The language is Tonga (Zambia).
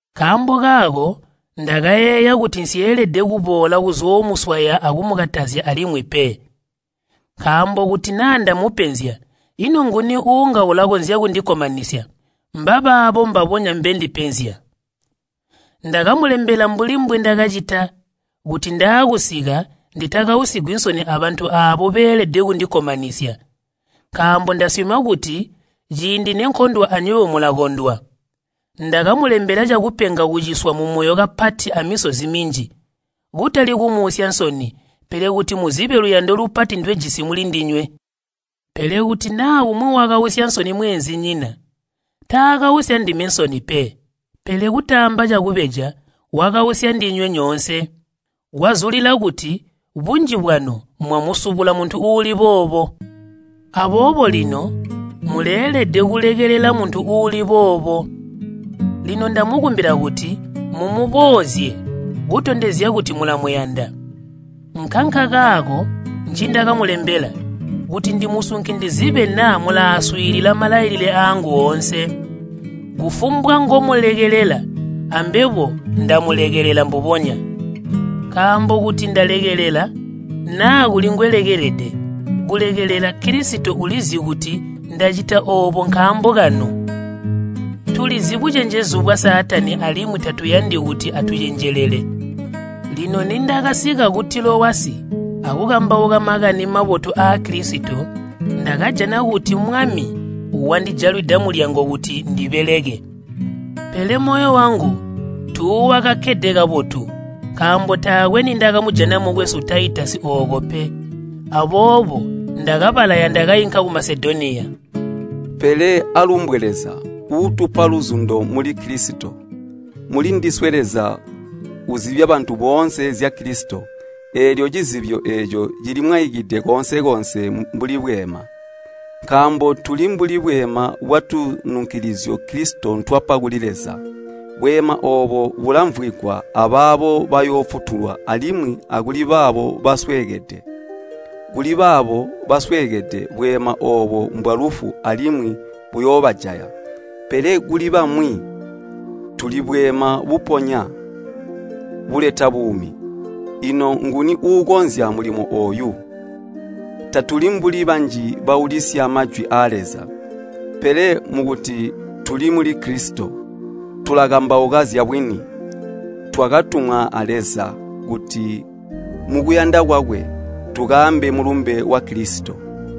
Nkaambo kaako ndakayeeya kuti nsyeelede kuboola kuzoomuswaya akumukatazya alimwi pe. Nkaambo kuti naa ndamupenzya, ino nguni uunga ulakonzya kundikkomanisya? Mbabaabo mbabonya mbendipenzya. Ndakamulembela mbuli mbwindakacita, kuti ndaakusika nditakausigwi nsoni abantu aabo beelede kundikkomanisya. Nkaambo ndasyoma kuti ciindi nenkondwa anywebo mulakondwa. Ndakamulembela cakupenga kuciswa mumoyo kapati amisozi minji, kutali kumuusya nsoni, pele kuti muzibe luyando lupati ndwejisi mulindinywe. Pele kuti naa umwi wakausya nsoni mweenzinyina, taakausya ndime nsoni pe, pele kutaamba cakubeja wakausya ndinywe nyoonse. Kwazulila kuti bunji bwanu mwamusubula muntu uuli boobo. Aboobo lino muleelede kulekelela muntu uuli boobo. Lino ndamukumbila kuti mumuboozye kutondezya kuti mulamuyanda. Nkankakaako ncindakamulembela, kuti ndimusunke ndizibe naa mulaaswiilila malailile aangu oonse. Kufumbwa ngomulekelela, ambebo ndamulekelela mbubonya. Nkaambo kuti ndalekelela, naa kuli ngweelede kulekelela, Kilisito ulizi kuti ndacita oobo nkaambo kanu. Tulizi bucenjezu bwa Saatani alimwi tatuyandi kuti atucenjelele. Lino nindakasika ku Tilowasi akukambauka Makani Mabotu aa Kilisito ndakajboa kuti Mwami wandijalwida mulyango kuti ndibeleke. Pele moyo wangu tuuwakakkede kabotu, nkaambo taakwe nindakamujana mukwesu Taitasi ooko pe. Aboobo ndakabalaya ndakainka ku Masedoniya. Pele aalumbwe Leza, uutupa luzundo muli Kilisito. Mulindiswe Leza uzibya bantu boonse zya Kilisito, eelyo cizibyo eeco cilimwaikide koonse-koonse mbuli bweema. Nkaambo tuli mbuli bweema bwatununkilizyo Kilisito ntwapa kuli Leza. Bweema oobo bulamvwigwa abaabo bayoofutulwa alimwi akuli baabo basweekede. Kuli baabo basweekede bweema oobo mbwalufu alimwi buyoobajaya, pele kuli bamwi tuli bweema buponya buleta buumi. Ino nguni uukonzya mulimo ooyu? Tatuli mbuli banji baulisya Majwi aa Leza. Pele mukuti tuli muli Kilisito, tulakambauka zyabwini. Twakatumwa a Leza kuti mukuyanda kwakwe tukaambe Mulumbe wa Kilisito.